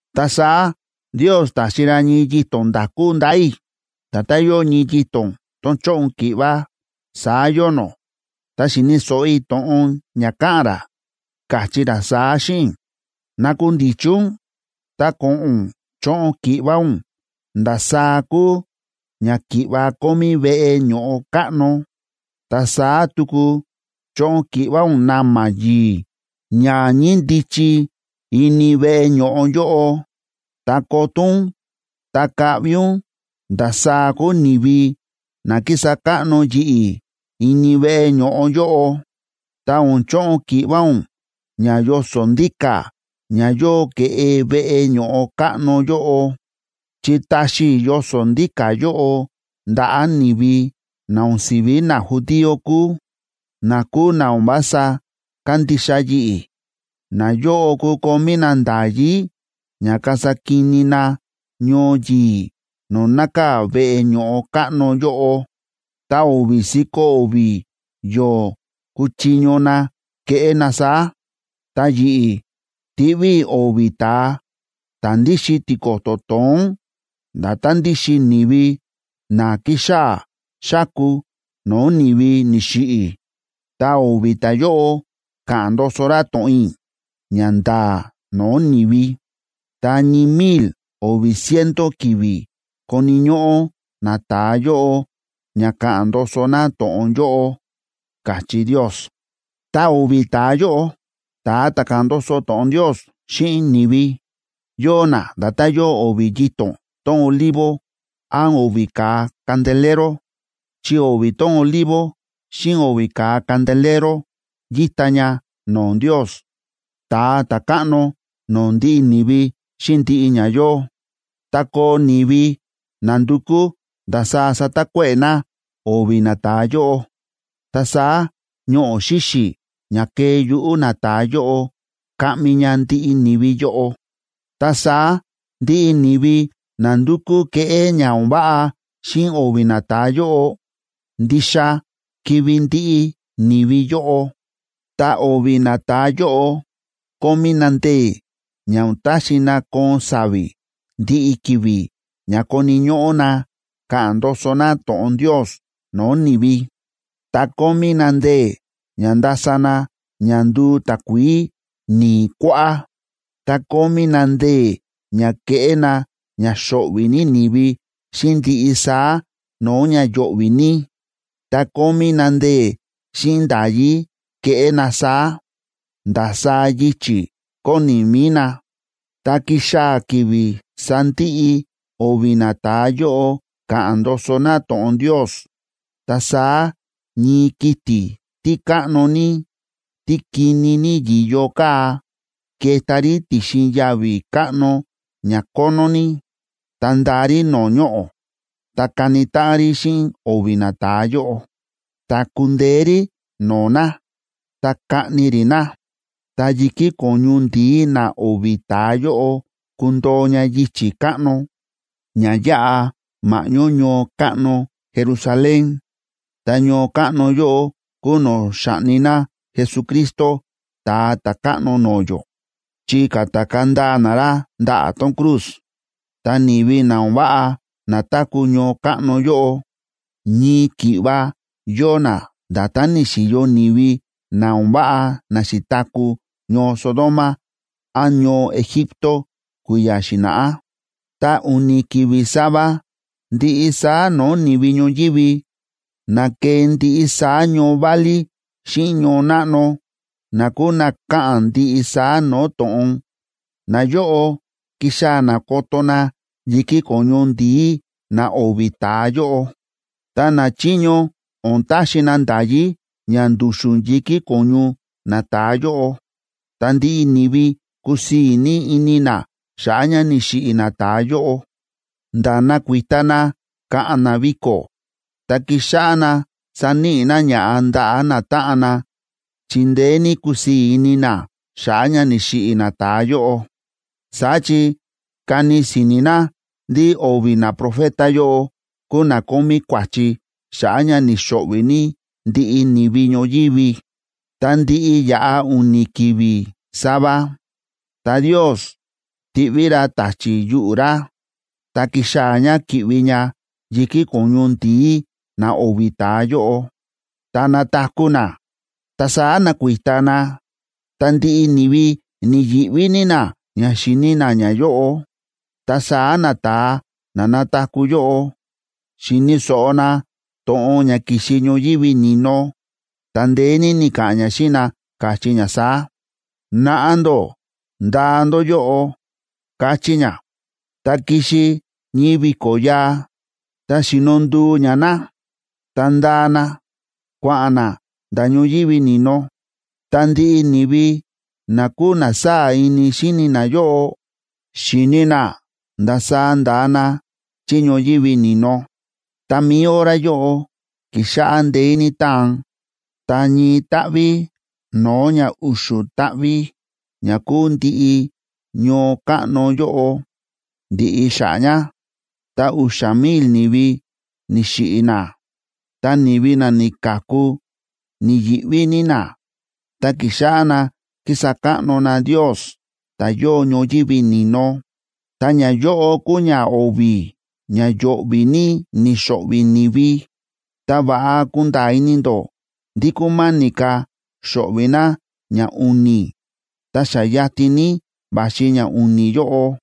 Ta saá Ndios ta̱xi ra ñii yito̱n nda̱kú ndaꞌa̱ i̱, nda̱tán yóo ñii yito̱n tón chóꞌon ki̱ꞌva, saá yóo nó. Ta xi̱ni̱ so̱ꞌo i̱ to̱ꞌon ña káꞌa̱n ra, káchí ra saá xíꞌin i̱: ―Nakundichi ún, ta ko̱ꞌo̱n ún choꞌon ki̱ꞌva ún ndasaá kúu ña ki̱ꞌva kómí veꞌe ño̱ꞌo káꞌno, ta saá tuku choꞌon ki̱ꞌva ún na̱ma̱ yi̱i̱ ña ñíndichi ini veꞌe ño̱ꞌo yóꞌo, ta koto ún ta kaꞌvi ún ndasaá kúu ni̱vi na kísa káꞌno yi̱ꞌi̱ ini veꞌe ño̱ꞌo yóꞌo. Ta o̱n choꞌon ki̱ꞌva ún ña yoso̱ ndíka̱ ña yóo ke̱ꞌe veꞌe ño̱ꞌo káꞌno yóꞌo, chi ta̱xi i̱ yoso̱ ndíka̱ yóꞌo ndaꞌa̱ ni̱vi na o̱n si̱ví najudío kúu, na kúu na o̱n vása kándixa yi̱ꞌi̱. Nayóꞌo kukomí na nda̱yí ña kasa kini na ñoo yi̱i̱ no̱o̱ nákaa̱ veꞌe ño̱ꞌo káꞌno yóꞌo, ta o̱vi̱ si̱ko̱ o̱vi̱ yo̱o̱ kuchiño na keꞌé na saá. Ta yi̱ꞌi̱, tiꞌví i̱ o̱vi̱ ta̱a ta̱ ndíxin tiko̱to̱ to̱ón nda̱tán ndíxin ni̱vi na kíxaa̱ xáku no̱o̱ ni̱vi ni̱xiꞌi̱, ta o̱vi̱ ta̱yóꞌo ka̱ꞌa̱n ndoso ra to̱ꞌon i̱ ña nda̱a̱ no̱o̱ ni̱vi. Ta ñii mil o̱vi̱ ciento ki̱vi̱ koni̱ ñóꞌó nata̱a yóꞌo ña ka̱ꞌa̱n ndoso na to̱ꞌon yóꞌo ―káchí Ndios. Ta o̱vi̱ ta̱a yóꞌo, ta̱a ta̱ káꞌa̱n ndoso to̱ꞌon Ndios xíꞌin ni̱vi, yóo na nda̱tán yóo o̱vi̱ yito̱n tón olivo án o̱vi̱ ka̱a candelero. Chi o̱vi̱ tón olivo xíꞌin o̱vi̱ ka̱a candelero yíta ña no̱o̱ Ndios, ta̱a ta̱káꞌno no̱o̱ ndiꞌi ni̱vi xíꞌin ndiꞌi ña yóo. Tá koo ni̱vi na ndukú ndasaá satakuéꞌe̱ na o̱vi̱ nata̱a yóꞌo, ta saá ñoꞌo̱ xíxi̱ ña kee yuꞌu̱ nata̱a yóꞌo kaꞌmi ña ndiꞌi ni̱vi yóꞌo. Ta saá ndiꞌi ni̱vi na ndukú keꞌé ña o̱n váꞌa xíꞌin o̱vi̱ nata̱a yóꞌo, ndixa kivi̱ ndiꞌi ni̱vi yóꞌo. Ta o̱vi̱ nata̱a yóꞌo kómí na ndee̱ ña o̱n taxi na koon sa̱vi̱ ndiꞌi ki̱vi̱ ña koni̱ ñóꞌó na ka̱ꞌa̱n ndoso na to̱ꞌon Ndios no̱o̱ ni̱vi. Ta kómí na ndee̱ ña ndasa na ña nduu takuií ni̱i̱ kuáꞌá, ta kómí na ndee̱ ña keꞌé na ña xo̱ꞌvi̱ ní ni̱vi xíꞌin ndiꞌi saá no̱o̱ ña yo̱ꞌvi̱ ní. Ta kómí na ndee̱ xíꞌin nda̱yí keꞌé na saá, ndasaá yichi̱ kóni mi̱i na. Tá kixaa̱ ki̱vi̱ sandiꞌi o̱vi̱ nata̱a yóꞌo ka̱ꞌa̱n ndoso na to̱ꞌon Ndios, ta saá ñii kiti̱ tí káꞌno ní, tí kini ní yi̱yo káa, keta rí ti̱xin yavi̱ káꞌno ña kónó ní. Ta ndaa rí no̱o̱ ñoꞌo̱, ta kani táꞌan rí xíꞌin o̱vi̱ nata̱a yóꞌo. Ta kundeé rí no̱o̱ na, ta kaꞌni rí na. Ta yi̱kí ko̱ñu ndi̱í na o̱vi̱ ta̱a yóꞌo kundoo ña yichi̱ káꞌno ña yáꞌa ma̱ꞌñó ñoo káꞌno Jerusalén. Ta ñoo káꞌno yóꞌo kúu no̱o̱ xa̱ꞌni na Jesucristo Ta̱a Ta̱káꞌno no̱o̱ yó, chi ka̱takaa̱ ndaa na ra ndaꞌa̱ tón cruz. Ta ni̱vi na o̱n váꞌa na táku̱ ñoo káꞌno yóꞌo, ñii ki̱ꞌva yóo na nda̱tán ni̱xi̱yo ni̱vi na o̱n váꞌa na xi̱taku̱ ñoo Sodoma án ñoo Egipto kui̱ya̱ xi̱na̱ꞌá. Ta u̱ni̱ ki̱vi̱ sava, ndiꞌi saá no̱o̱ ni̱vi ñoyívi, na ke̱e ndiꞌi saá ñoo válí xíꞌin ñoo náꞌno, na kúu na káꞌa̱n ndiꞌi saá no̱o̱ to̱ꞌon, nayóꞌo kixaa̱ na koto na yi̱kí ko̱ñu ndi̱í na o̱vi̱ ta̱a yóꞌo. Ta nachiño o̱n taxi na nda̱yí ña ndu̱xu̱n yi̱kí ko̱ñu nata̱a yóꞌo. Ta ndiꞌi ni̱vi kusii̱ ní ini na xa̱ꞌa̱ ña ni̱xiꞌi̱ nata̱a yóꞌo, nda̱ nakuita na ka̱ꞌa̱n na viko̱, ta kixáꞌá na saníꞌi na ña̱ꞌa ndaꞌa̱ natáꞌan na chi ndeé ní kusii̱ ini na xa̱ꞌa̱ ña ni̱xiꞌi̱ nata̱a yóꞌo. Saá chi kani si̱ni̱ na ndí o̱vi̱ naprofeta yóꞌo kúu na kómí kua̱chi xa̱ꞌa̱ ña ni̱xo̱ꞌvi̱ ní ndiꞌi ni̱vi ñoyívi. Ta ndi̱ꞌi ya̱ꞌa u̱ni̱ ki̱vi̱ sava, ta Ndios ti̱ꞌví ra ta̱chi̱ yuꞌu̱ ra, ta ki̱xaa̱ ña kíꞌvi ña yi̱kí ko̱ñu ndi̱í na o̱vi̱ ta̱a yóꞌo, ta na̱taku̱ na. Ta saá na̱kuita na, ta ndiꞌi ni̱vi ni̱yi̱ꞌví ní na ña xíni na ñayóꞌo. Ta saá nata̱a na na̱taku̱ yóꞌo, xi̱ni̱ so̱ꞌo na to̱ꞌon ña ki̱xi ñoyívi ni̱no, ta ndeé ní ni̱ka̱ꞌa̱n ña xíꞌin na, káchí ña saá: ―Naꞌa ndó ndaa ndó yóꞌo ―káchí ña. Ta ki̱xi ñii vi̱ko̱ yaa, ta xi̱no nduu ña na, ta nda̱a na, kua̱ꞌa̱n na nda̱ ñoyívi ni̱no. Ta ndiꞌi ni̱vi na kúu na sáa̱ ini xíni nayóꞌo, xi̱ni na ndasaá nda̱a na chí ñoyívi ni̱no. Ta mi̱i hora yóꞌo, ki̱xáꞌá ndeé ní táan, ta ñii táꞌví no̱o̱ ña u̱xu̱ táꞌví ña kúu ndiꞌi ñoo káꞌno yóꞌo, ndi̱ꞌi xa̱ꞌa̱ ña, ta u̱xa̱ mil ni̱vi ni̱xiꞌi̱ na. Ta ni̱vi na ni̱ka̱ku ni̱yi̱ꞌví ní na, ta ki̱xáꞌá na kísa káꞌno na Ndios ta̱ yóo ñoyívi ni̱no. Ta ñayóꞌo kúu ñao̱vi̱ ña yo̱ꞌvi̱ ní ni̱xo̱ꞌvi̱ ni̱vi. Ta va̱ꞌa kunda̱a̱ ini ndó ndí kúma̱ni̱ ka̱ xo̱ꞌvi̱ na ñau̱ni̱, ta xa yatin ní va̱xi ñau̱ni̱ yóꞌo.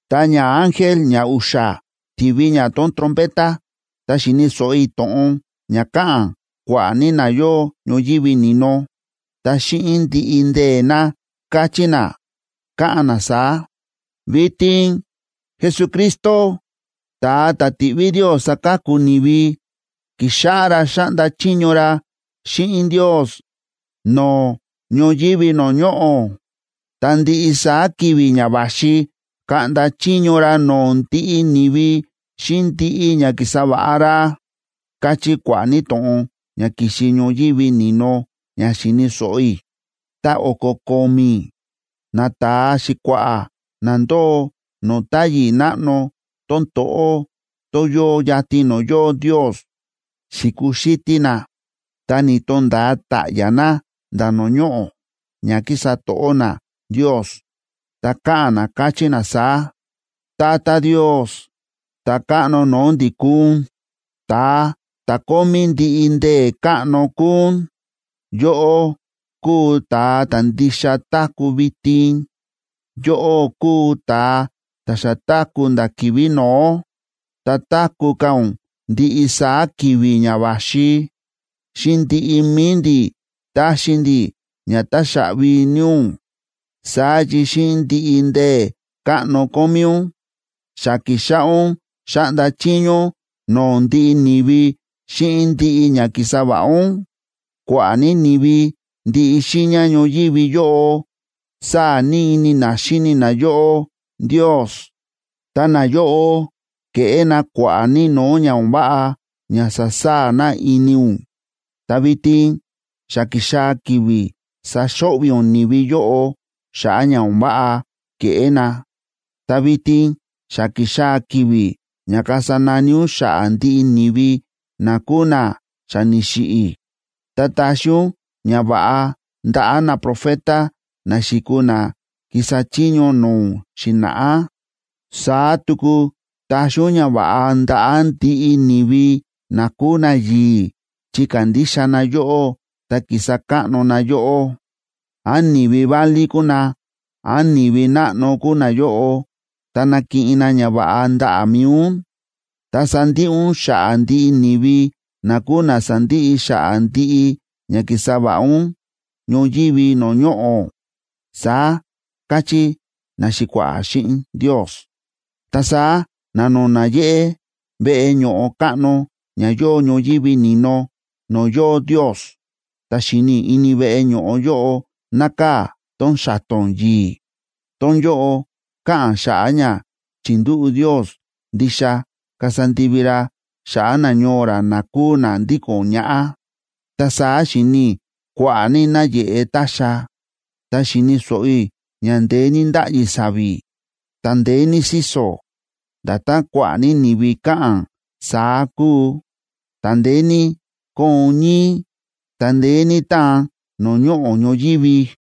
Ta ñaángel ñau̱xa̱ ti̱vi ña tón trompeta, ta xi̱ni̱ so̱ꞌo i̱ to̱ꞌon ña káꞌa̱n kua̱ꞌa̱ ní na yóo ñoyívi ni̱no, ta xíꞌin ndiꞌi ndee̱ na káchí na, káꞌa̱n na saá: Vitin Jesucristo, ta̱a ta̱ ti̱ꞌví Ndios saka̱ku ni̱vi, ki̱xáꞌá ra xáꞌnda chiño ra xíꞌin Ndios no̱o̱ ñoyívi no̱o̱ ñoꞌo̱. Ta ndiꞌi saá ki̱vi̱ ña va̱xi kaꞌnda chiño ra no̱o̱ ndiꞌi ni̱vi xíꞌin ndiꞌi ña ki̱sa va̱ꞌa ra, káchí kua̱ꞌa̱ ní to̱ꞌon ña ki̱xi ñoyívi ni̱no ña xi̱ni̱ so̱ꞌo i̱. Ta o̱ko̱ ko̱mi̱ nata̱a xi̱kua̱ꞌa̱ na ndóo no̱o̱ táyi̱ náꞌno tón to̱ꞌó, tón yóo yatin no̱o̱ yóo Ndios, xi̱kuxítí na, ta ni̱to̱nda̱a ta̱ꞌya̱ na nda̱ no̱o̱ ñoꞌo̱ ña ki̱sa to̱ꞌó na Ndios, ta káꞌa̱n na, káchí na saá: Tata Ndios, Ta̱káꞌno no̱o̱ ndi̱ kúu ún, ta̱a ta̱ kómí ndiꞌi ndee̱ káꞌno kúu ún, yóꞌó kúu ta̱a ta̱ ndixa táku̱ vitin, yóꞌó kúu ta̱a ta̱ xa táku̱ nda̱ ki̱vi̱ no̱ó, ta táku̱ ka̱ ún ndiꞌi saá ki̱vi̱ ña va̱xi. Xíꞌin ndiꞌi mi̱i ndi̱ táxi ndi̱ ña táxaꞌvi ní ún, saá chi xíꞌin ndiꞌi ndee̱ káꞌno kómí ún, xa ki̱xáꞌá ún xáꞌnda chiño ún no̱o̱ ndiꞌi ni̱vi xíꞌin ndiꞌi ña ki̱sa va̱ꞌa ún. Kua̱ꞌa̱ ní ni̱vi ndiꞌi xiiña ñoyívi yóꞌo sáa̱ ní ini na xíni na yóꞌó, Ndios. Ta nayóꞌo ke̱ꞌé na kua̱ꞌa̱ ní no̱o̱ ña o̱n váꞌa ña sa̱saa̱ na ini ún. Ta vitin xa ki̱xaa̱ ki̱vi̱ saxo̱ꞌvi̱ ún ni̱vi yóꞌo xa̱ꞌa̱ ña o̱n váꞌa ke̱ꞌé na. Ta vitin xa ki̱xaa̱ ki̱vi̱ ña kasa nani ún xa̱ꞌa̱ ndiꞌi ni̱vi na kúu na xa ni̱xiꞌi̱, ta taxi ún ñava̱ꞌa ndaꞌa̱ naprofeta, na xi̱kuu na ki̱sa chiño no̱o̱ ún xi̱na̱ꞌá. Saá tuku taxi ún ñava̱ꞌa ndaꞌa̱ ndiꞌi ni̱vi na kúu nayi̱i̱ chi kándixa na yóꞌó ta kísa káꞌno na yóꞌó, án ni̱vi válí kúu na, án ni̱vi náꞌno kúu nayóꞌo, ta nakiꞌin na ñava̱ꞌa ndaꞌa̱ mi̱i ún. Ta sandiꞌi ún xa̱ꞌa̱ ndiꞌi ni̱vi na kúu na sa̱ndiꞌi xa̱ꞌa̱ ndiꞌi ña ki̱sa va̱ꞌa ún ñoyívi no̱o̱ ñoꞌo̱, saá káchí naxi̱kua̱ꞌa̱ xíꞌin Ndios. Ta saá na̱no̱na̱ yéꞌé veꞌe ño̱ꞌo káꞌno ña yóo ñoyívi ni̱no no̱o̱ yóo Ndios, ta xi̱ni i̱ ini veꞌe ño̱ꞌo yóꞌo nákaa̱ tón xa̱to̱n yi̱i̱. Tón yóꞌo káꞌa̱n xa̱ꞌa̱ ña chi̱ndúꞌu̱ Ndios ndixa kasa ndivi ra xa̱ꞌa̱ nañoo ra na kúu na ndíko̱n ñaꞌá. Ta saá xi̱ni i̱ kua̱ꞌa̱ ní náyeꞌe ta̱xa̱, ta xi̱ni̱ so̱ꞌo i̱ ña ndeé ní ndáꞌyi sa̱vi̱, ta ndeé ní síso̱, nda̱tán kua̱ꞌa̱ ní ni̱vi káꞌa̱n, saá kúu. Ta ndeé ní kóon ñíí, ta ndeé ní táan no̱o̱ ñoꞌo̱ ñoyívi.